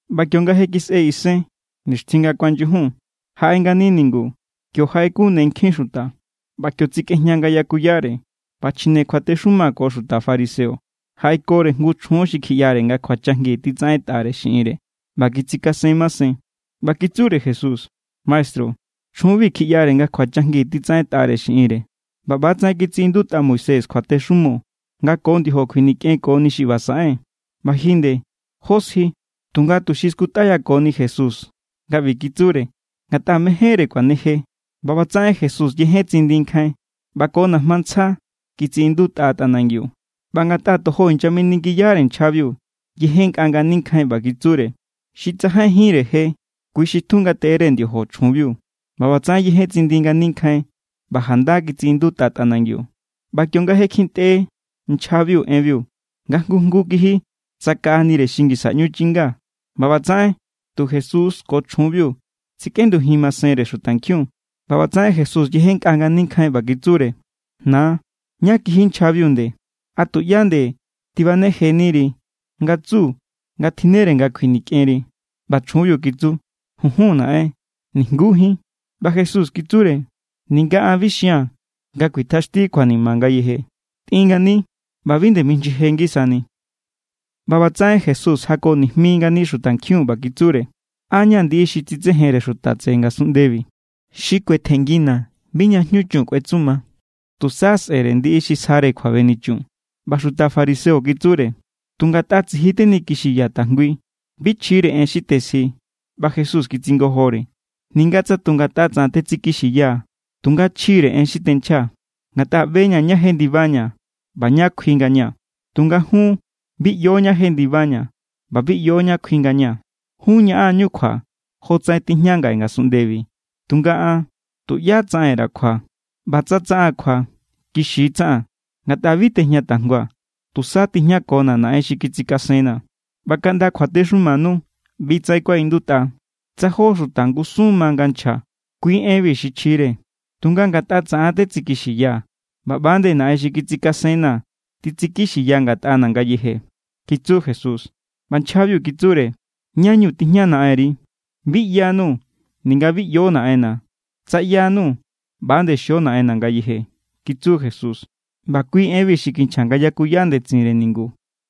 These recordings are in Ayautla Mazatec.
ꞌBa kionga je kisꞌe isen nixtjin nga kuanyujun, jaꞌe ngani ningu. Kio jaꞌekun ne nkjin xuta, ꞌba kio tsikꞌejña nga yakuyare. ꞌBa chjine kjuatexuma ko xuta fariseo jaꞌekore jngu chjun xi kjiꞌyare nga kjuachajngi titsaꞌentꞌare xiꞌinre ꞌba kitsikasen masen. ꞌBa kitsure Jesús: —Maestru, chjunbi kjiꞌyare nga kjuachajngi titsaꞌentꞌare xiꞌinre. ꞌBa ꞌbatsaꞌen kitsiꞌindutꞌa Moisés kjuatexumo nga ko ndiojo kjuinikꞌenkoni xi ꞌba saꞌen. ꞌBa ji nde, ¿jó sji? Tunga tuxi kiskutꞌayako=ni Jesús nga ꞌbi kitsure, ngatꞌa mejénre kuaneje. ꞌBa ꞌbatsaꞌen Jesús yejen tsindi nkjain ꞌba ko najma ntsja kitsiꞌindutꞌa tꞌanangiu. ꞌBa ngatꞌa tojo inyaminingiyare nchjabiu, yejennkꞌa ngani nkjain ꞌba kitsure: —Xi tsajainjínre je, kui xi titjun ngateꞌere ndiojo chjunbiu. ꞌBa ꞌbatsaꞌen yejen tsindi ngani nkjain ꞌba janda kitsiꞌindutꞌa tꞌanangiu. ꞌBa kionga kjintꞌe nchjabiu enbiu, nga jngu jngu kiji tsakaꞌanire xi ngisa ꞌñu chinga. ꞌBa ꞌbatsaꞌen tu Jesús ko chjunbiu tsikꞌendujin masenre xutankjiun. ꞌBa ꞌbatsaꞌen Jesús yejennkꞌa ngani nkjain ꞌba kitsure: —Na, ¿ñá kiji nchjabiu nde? ¿A tuꞌyá nde tibanejeniri nga tsu nga tjinnere nga kjuinikꞌenri? ꞌBa chjunbiu kitsu: —Junjun, naꞌen. Nijngujín. ꞌBa Jesús kitsure: —Ninga an bi xia̱n nga kuitjaxti kjuanima ngayeje. Tꞌin ngani ꞌba bi nde mijnyije ngisani. ꞌBa ꞌbatsaꞌen Jesús jako ngani xutankjiun ꞌba kitsure: —An= ña̱ ndiꞌi xi tsitsejenre xuta tseꞌe ngasunꞌndebi. Xi kuetjenngina̱ bi ña jñu chun kuetsuma. Tusa sꞌe̱re ndiꞌi xi sjare kjuabenichun. ꞌBa xuta fariseo kitsure: —Tu ngatꞌa tsiji tenikixiya tajngui. Bi chjire en xi tesji. ꞌBa Jesús kitsingojore: —Ninga tsa tu ngatꞌa tsaꞌan tetsikixiyaa̱, tunga chjire en xi tenchjaa̱, ngatꞌa ꞌbe=ña̱ ñá jendibaña̱ ꞌba ñá kjui ngaña̱. Tunga jun bi ꞌyo ñá jendibaña̱ ꞌba bi ꞌyo ñá kjui ngaña̱. Jun ñaꞌan=ñu kjua jotsaꞌen tijña ngaꞌe ngasunꞌndebi, tunga an tuꞌyá tsaꞌen_ra̱ kjua. ꞌBa tsa tsaꞌaa̱n kjua, kixi tsaꞌaa̱n, ngatꞌa bi tejña tajngua̱. Tusa tijñakona̱ Naꞌen xi kitsikasenna̱. ꞌBa kaꞌnda kjuatexumanu ꞌbi= tsaꞌen kuaꞌindutꞌa: “Tsa jó xuta ngusun ma nga nchja, kui enbi xi chjire.” Tu ngatꞌa taꞌan= tetsikixiyaa̱, ꞌba ꞌba=nde Naꞌen xi kitsikasenna̱ titsikixiya ngatꞌana̱ ngayeje —kitsu Jesús. ꞌBa nchjabiu kitsure: —¿Ñá=ñu tijña Naꞌenri? —Bi ꞌyanuu̱ ninga bi ꞌyo Naꞌenna̱. Tsa ꞌyanuu̱, ꞌba=nde xio Naꞌenna̱ ngayeje —kitsu Jesús. ꞌBa kui enbi xi kinchja nga yakuya ndetsinre ningu,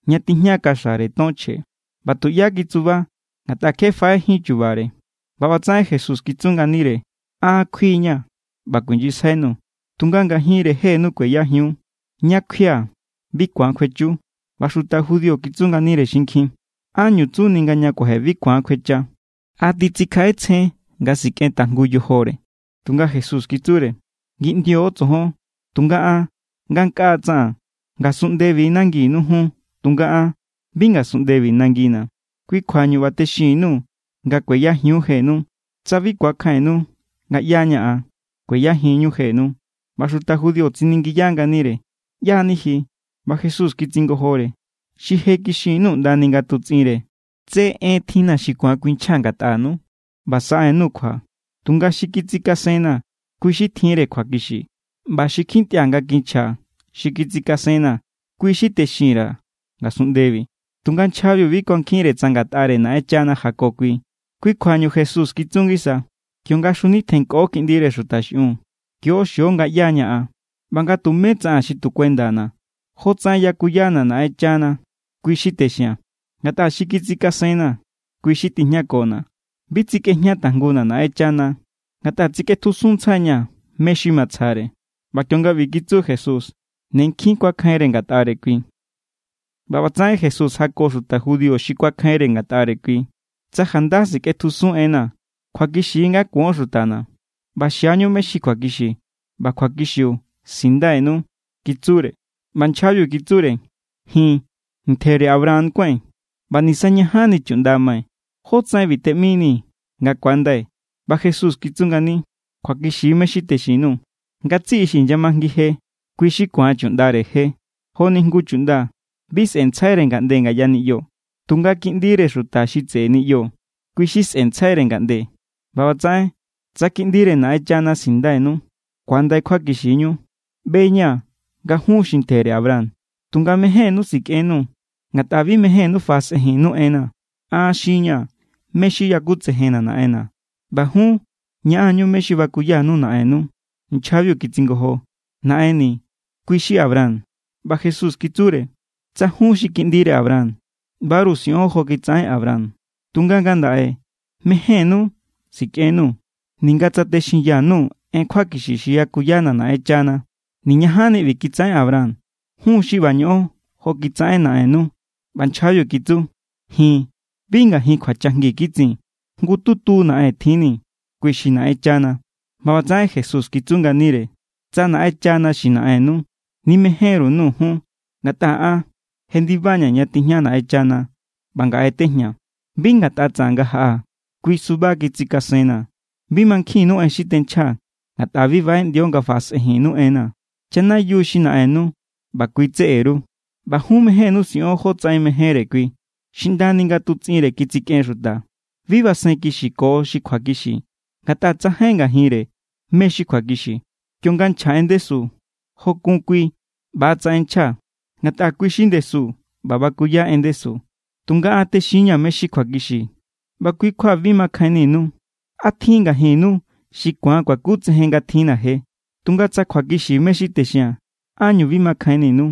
ña tijña kaxare ton chje. ꞌBa tuꞌyá kitsuba, ngatꞌa kje faꞌejín chubare. ꞌBa ꞌbatsaꞌen Jesús kitsu nganire: —An= kjui=ña̱ ꞌba kuijnyisjainuu̱, tunga ngajinre jenu kueyajiun. Ña kjuia̱ bi ku̱an kjuechu. ꞌBa xuta judío kitsu nganire xinkjin: —¿Ánñu tsuni nga ña kuaje bi ku̱an kjuecha? ¿A titsikjaꞌetsjen nga sikꞌen tajngu yojore? Tunga Jesús kitsure: —Ngindio tsojon, tunga an ngankꞌaa tsaꞌan. Ngasunꞌndebi= nanginu jun, tunga an bi ngasunꞌndebi nangina̱. Kui= kjuañu ꞌba texinni_nuu̱ nga kueyajiun jenu. Tsa bi ku̱akjainnu nga ꞌyá= ña̱ an, kueyajinñu jenu. ꞌBa xuta judío tsiningiya nganire: —¿ꞌYá=ni ji? ꞌBa Jesús kitsingojore: —Xi je kixin_nuu̱ ꞌndani nga tutsꞌinre. Tse en tjinna̱ xi ku̱an kuinchjaa̱ ngatꞌanu ꞌba saꞌen_nuu̱ kjua. Tunga xi kitsikasenna̱, kui= xi tjinre kjuakixi. ꞌBa xi kjintꞌia̱ nga kinchja xi kitsikasenna̱, kui= xi texin_ra̱ ngasunꞌndebi. Tunga nchjabiu bi kuankjinre tsa ngatꞌare Naꞌenchana jako kui. Kui kjuañu Jesús kitsu ngisa: —Kionga xjunitjennkꞌo Kiꞌndire Xuta xiꞌiun, kio xio nga ꞌyá= ña̱ an ꞌba nga tumé tsaꞌaa̱n xi tu kuendana̱. Jotsaꞌen yakuyana̱ Naꞌenchana, kui= xi texia̱n. Ngatꞌa xi kitsikasenna̱, kui= xi tijñakona̱. Bi tsikꞌejña tajnguna̱ Naꞌenchana, ngatꞌa tsikꞌetjusun ntsjai=ña̱ mé= xi matsjare. ꞌBa kionga ꞌbi titsu Jesús, ne nkjin kuakjainre ngatꞌare kui. ꞌBa ꞌbatsaꞌen Jesús jako xuta judío xi kuakjainre ngatꞌare kui: —Tsa janda sikꞌetjusun enna̱, kjuakixi= nga kuon xutana̱, ꞌba xiañu mé= xi kjuakixi, ꞌba kjuakixiu sinndainu —kitsure. ꞌBa nchjabiu kitsure: —Ji̱n ntjere Abraham kuái̱n, ꞌba nisañajanni chuꞌnda mai̱. ¿Jótsaꞌen ꞌbi teꞌminii̱ nga ku̱andai̱? ꞌBa Jesús kitsu ngani: —Kjuakixi mé= xi texin_nuu̱. Ngatsiꞌi xi inyamajngi je, kui= xi kuán chuꞌndare je. Joni jngu chuꞌnda, bi sꞌentsjaire ngaꞌnde ngaya niꞌyo. Tunga kiꞌndire xuta xi tseꞌe niꞌyo, kui= xi sꞌentsjaire ngaꞌnde. ꞌBa ꞌbatsaꞌen, tsa Kiꞌndire Naꞌenchana sinndainu, ku̱andai kjuakixinu. ꞌBe=ña̱ nga jun xi ntjere Abraham, tunga mejénnú sikꞌennuu̱, ngatꞌa bi mejénnú faꞌasꞌejinnu enna̱. An xinña̱ mé= xi yakutsejenna̱ Naꞌenna̱, ꞌba jun ñaꞌan=ñu mé= xi bakuyanu naꞌennu. Nchjabiu kitsingojo: —Naꞌenni̱, kui= xi Abraham. ꞌBa Jesús kitsure: —Tsa jun xi kiꞌndire Abraham, ꞌbaru siꞌon jo kitsaꞌen Abraham. Tunga ngandaꞌe mejénnú sikꞌennuu̱, ninga tsa texinya_nuu̱ en kjuakixi xi yakuyana̱ Naꞌenchana. Niñajanni ꞌbi kitsaꞌen Abraham. Jun= xi ꞌba ñoꞌon jo kitsaꞌen naꞌennu. ꞌBa nchjabiu kitsu: —Ji̱n bi ngajin kjuachajngi kitsin. Jngututu naꞌen tjinni̱, kui xi Naꞌenchana. ꞌBa ꞌbatsaꞌen Jesús kitsu nganire: —Tsa Naꞌenchana xi naꞌennu, nimején=ru_nuu̱ jun, ngatꞌa an jendiba=ña̱ ña tijña Naꞌenchana ꞌba ngaꞌe tejñaa̱. Bi ngatꞌa tsaꞌan nga jaꞌaa̱. Kui suba kitsikasenna̱. Bi mankjinnu en xi tenchjaa̱, ngatꞌa bi baꞌeꞌndio nga faꞌasꞌenjinnu enna̱. Chanayiu xi naꞌennu ꞌba kui tseꞌe_ru. ꞌBa jun mejénnú siꞌon jotsaꞌen mejénre kui. Xi ꞌndani nga tutsꞌinre kitsikꞌen xuta. Bi basen kixiko xi kjuakixi, ngatꞌa tsajain ngajinre mé= xi kjuakixi. Kionga nchja en ndesu, jo kun kui ꞌba=tsaꞌen nchja, ngatꞌa kui= xi ndesu ꞌba bakuya en ndesu. Tunga an texin=ña̱ mé= xi kjuakixi, ꞌba kui= kjua bi makjainninu. ¿A tjin= ngajinnu xi ku̱an kuakutsejen nga tjinna̱ je? Tunga tsa kjuakixi mé= xi texia̱n, ¿ánñu bi makjainninu?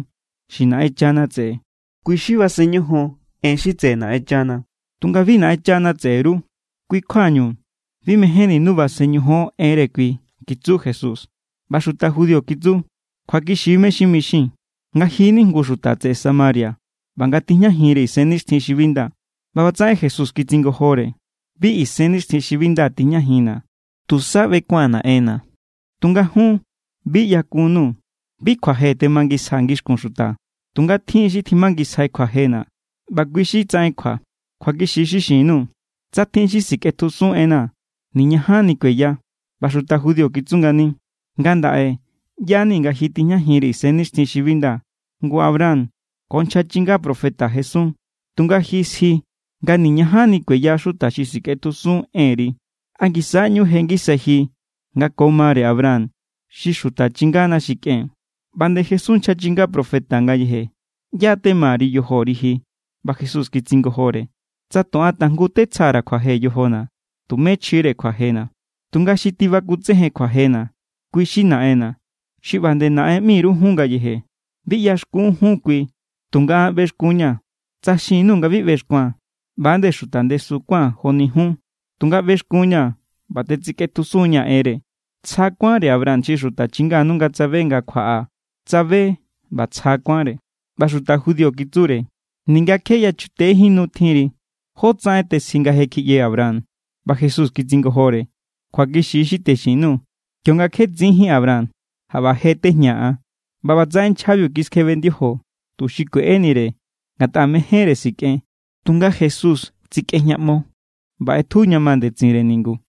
Xi Naꞌenchana tseꞌe, kui= xi basen ñojon en xi tseꞌe Naꞌenchana. Tunga bi Naꞌenchana tseꞌe_ru. Kui= kjuañu bi mejénninu basen ñojon enre kui —kitsu Jesús. ꞌBa xuta judío kitsu: —Kjuakixi= mé= xi mixii̱n, nga ji= ni jngu xuta tseꞌe Samaria ꞌba nga tijñajinri isennixtjin xi bi nda. ꞌBa ꞌbatsaꞌen Jesús kitsingojore: —Bi isennixtjin xi bi nda tijñajinna̱. Tusa ꞌbekua̱n Naꞌenna̱, tunga jun bi ꞌyakunnuu̱. Bi kjuaje temangisjaa̱ ngixkun xuta. Tunga tjin= xi tjimangisjai kjuajena̱, ꞌba kui= xi tsaꞌen kjua. Kjuakixi= xi xin_nuu̱. Tsa tjin xi sikꞌetjusun enna̱, niñajanni kueya. ꞌBa xuta judío kitsu ngani: —Ngandaꞌe ꞌya=ni nga ji tijñajinri isennixtjin xi bi nda. Ngu Abraham ko nchja chinga profeta jesun. Tunga ji sji nga niñajanni kueya xuta xi sikꞌetjusun enri. ¿A ngisa= ꞌñu je ngisai ji nga ko mare Abraham xi xuta chingana xi kꞌen? ꞌBa nde jesun nchja chinga profeta ngayeje. ¿ꞌYá= tema_ri yojori ji? ꞌBa Jesús kitsingojore: —Tsa tu an tajngu tetsjara̱ kjuaje yojona̱, tumé chjire kjuajena̱. Tunga xi tibakutsejen kjuajena̱, kui= xi Naꞌenna̱, xi ꞌba nde Naꞌen ꞌmi_ru jun ngayeje. Bi ꞌyaxkun jun kui, tunga an ꞌbexkun=ña̱. Tsa xin_nuu̱ nga bi ꞌbexkua̱n, ꞌba=nde xuta ndesu kuán joni jun. Tunga ꞌbexkun=ña̱ ꞌba tetsikꞌetjusun=ña̱ enre. Tsja kuánre Abraham xi xuta chinganu nga tsabe nga kjuaꞌaa̱. Tsabe ꞌba tsja kuánre. ꞌBa xuta judío kitsure: —Ninga kje yachutejín nu tjinri, ¿jótsaꞌen tesji nga je kjiꞌye Abraham? ꞌBa Jesús kitsingojore: —Kjuakixi= xi texin_nuu̱. Kionga kje tsinjín Abraham, jaꞌba je tejñaa̱ an. ꞌBa ꞌbatsaꞌen nchjabiu kiskjebe ndiojo, tuxi kueꞌenire ngatꞌa mejénre sikꞌen. Tunga Jesús tsikꞌejñaꞌmo ꞌba ꞌetju ña ma ndetsinre ningu.